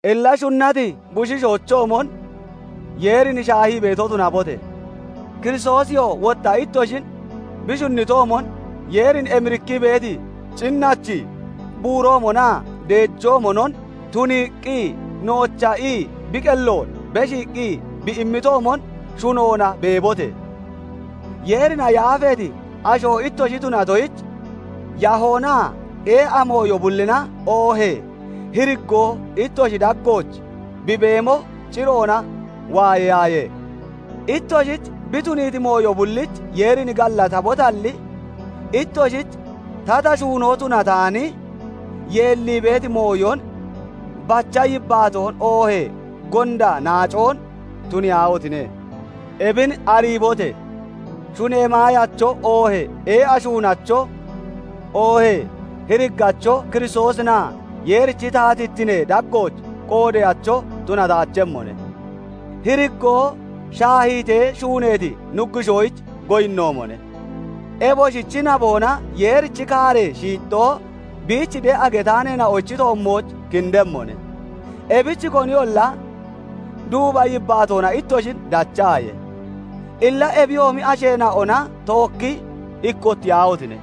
Illa shunnati bushiishoochoomon Yeerin shaahii beeto tunabote! Kiristoosiyoo wotta ittoshin bi shunnitoomon, Yeerin emirikkii beeti cinnachi buuroomonaa deejoomonon tuniiqqi noocha ii bi qelloon beshiiqqi bi immitoomon, shunoona beebote! Yeerina yaafeeti asho ittoshi tunatoyich, yahoonaa ee'a mooyo bullina oohee hiriggoo ittoshi daggooch bi beemo ciroona waayeyaaye; ittoshich bi tuniiti mooyo bullich Yeerin gallatabotalli, ittoshich tata shuunoo tunataani, yeellii beeti mooyon, bacha yibbaatoon oohee gonda naacoon tuniyaahotine! Ebin ariibote! Shunee maayacho, oohee ee'a shuunacho, oohee hiriggacho Kiristoosinaa Yeerinochi taatittinee daggooch qoodeyacho tunataachemmone; hiriggoo shaahiitee shuuneeti nuggushoyich goyinnoomone. Eboshichi naboona Yeerichi kaaree shiixxoo biich de'a getaaneena'ochi toommooch kindemmone; ebich koniyolla duuba yibbaatoona ittoshin dachaaye. Illa ebiyoomi asheena'ona tookki ikkottiyaahotine!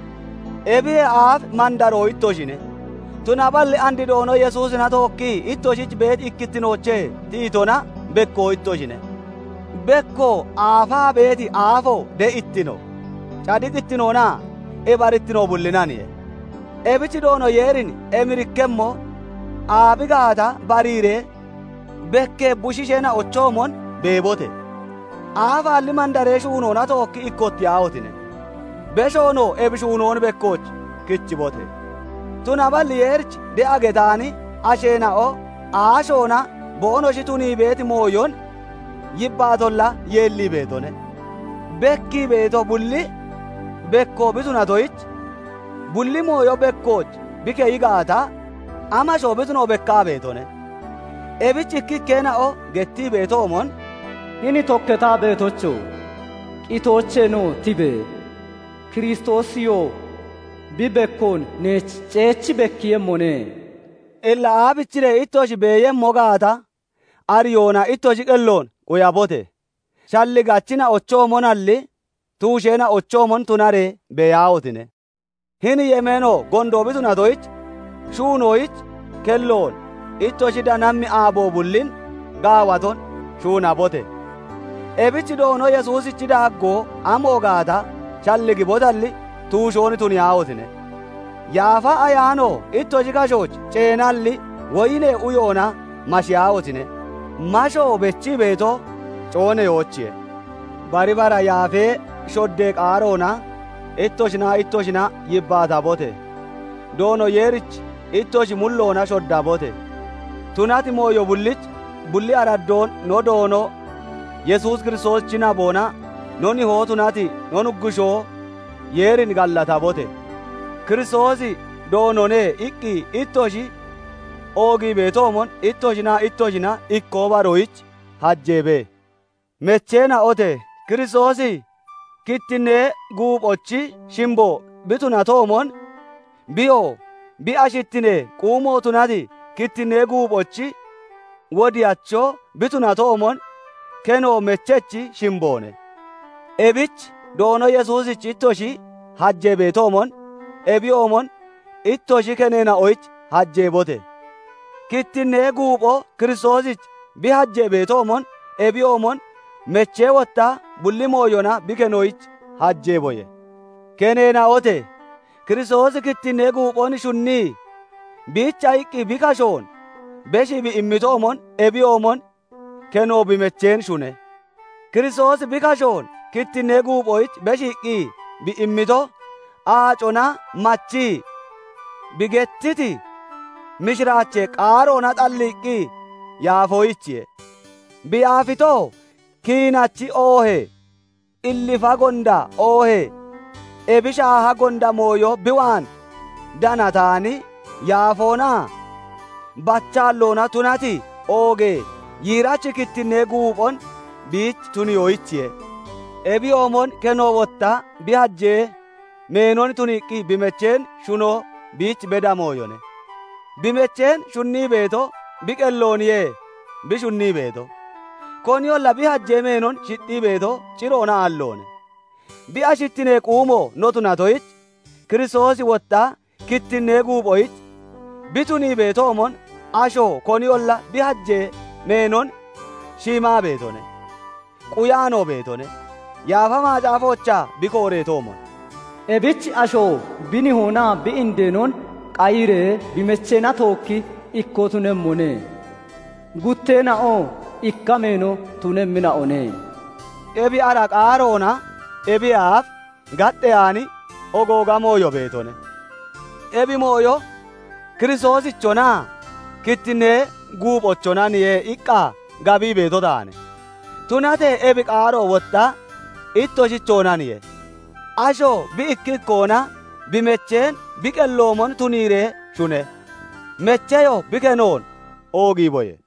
Ebiyee aaf mandaroo ittoshine; tunaballi and Doono Yesuusina tookkii ittoshich beeti ikkittinoochee tiyitona bekko ittoshine; bekko aafaa beeti aafo de'ittino, cadiqittinoonaa ibarittino bullinaniye; ebich Doono Yeerin emirikkemmo aabi gaata bariiree, bekkee bushiisheena'ochoomon beebote! Aafaalli mandaree shuunoona tookki ikkottiyaahotine! Beshoonoo ebi shuunoon bekkooch kichibote! Tunaballi Yeerich de'a getaani asheena'o aashoona boonoshi tunii beeti mooyon yibbaatolla yeellii beetone. Bekkii beeto bulli bekko bi tunatoyich, bulli mooyo bekkooch bi keyi gaata, amashoo bi tuno bekkaa beetone. Ebich ikkikkeena'o gettii beetoomon, H"ini tokkataa beetocho! Qitoocheenoo tibe! Kiristoosiyoo bi bekkoon neech ceechi bekkiiyemmone." Illa aabichiree ittoshi beeyemmo gaata ariyoona ittoshi qelloon quyabote! Shalligachina'ochoomonalli tuusheena'ochoomon tunaree beeyaahotine! Hini yemeeno gondo bi tunatoyich, shuunoyich kelloon ittoshi danammi aabo bullin gaawaton shuunabote! Ebich Doono Yesuusichi daaggoo amo gaata shalligibotalli, tuushoon tuniyaahotine! Yaafa Ayaano ittoshi kashooch ceenalli, woyinee uyoona mashiyaahotine! Masho bechii beeto cooneyoochiye. Bari bara yaafee shoddee qaaroona ittoshinaa ittoshina yibbaatabote! Doono Yeerich ittoshi mulloona shoddabote! Tunati mooyo bullich bulli araddoon no Doono Yesuus Kiristoosichi naboona no Nihoo tunati no Nuggushoo Yeerin gallatabote! "Kiristoosi Doonone" iqqi ittoshi oogii beetoomon, ittoshinaa ittoshina ikkoo baroyich hajeebe. Mecheena'ote! Kiristoosi kittinnee guuphochi shimbo bi tunatoomon, biyoo bi ashittinee quumo tunati kittinnee guuphochi wodiyacho bi tunatoomon, keno mechechi shimboone. Ebich Doono Yesuusich ittoshi hajee beetoomon, ebiyoomon ittoshi keneena'oyich hajeebote! Kittinnee guupho Kiristoosich bi hajee beetoomon, ebiyoomon mechee wotta bulli mooyona bi kenoyich hajeeboye. Keneena'ote! Kiristoosi kittinnee guuphon shunnii, biicha iqqi bi kashoon beshii bi immitoomon, ebiyoomon keno bi mecheen shune; Kiristoosi bi kashoon kittinnee guuphoyich beshiiqqi bi immito, aacona machii, bi gettiti mishiraachee qaaroona xalliiqqi yaafoyichiye; bi yaafitoo kiinachi oohee qillifa gonda oohee ebi shaaha gonda mooyo bi waan danataani, yaafoonaa bachaalloona tunati oogee yiirachi kittinnee guuphon biich tuniyoyichiye. Ebiyoomon keno wotta bi hajee meenon tuniiqqi bi mecheen shuno biich beda mooyone; bi mecheen shunnii beeto bi qellooniye bi shunnii beeto. Koniyolla bi hajee meenon shixxii beeto ciroona aalloone; bi ashittinee quumo no tunatoyich, Kiristoosi wotta kittinnee guuphoyich bi tunii beetoomon, asho koniyolla bi hajee meenon shiimaa beetone; quyaanoo beetone; Yaafa Macaafoochaa bi getteetoomon, "Ebich asho bi nihoonaa bi indeenon qayiree bi mecheena tookki ikkoo tunemmone; gutteena'oo ikka meeno tunemmina'one." Ebi ara qaaroona ebiyee aaf gaxxeyaani ooga mooyo beetone; ebi mooyo Kiristoosichonaa kittinnee guuphochonaniye iqqa gabii beeto taane. Tunatee ebi qaaro wotta ittoshichoonaniye; asho bi ikki ikkoona bi mecheen bi qelloomon tuniiree shune; mecheyoo bi kenoon oogiiboye.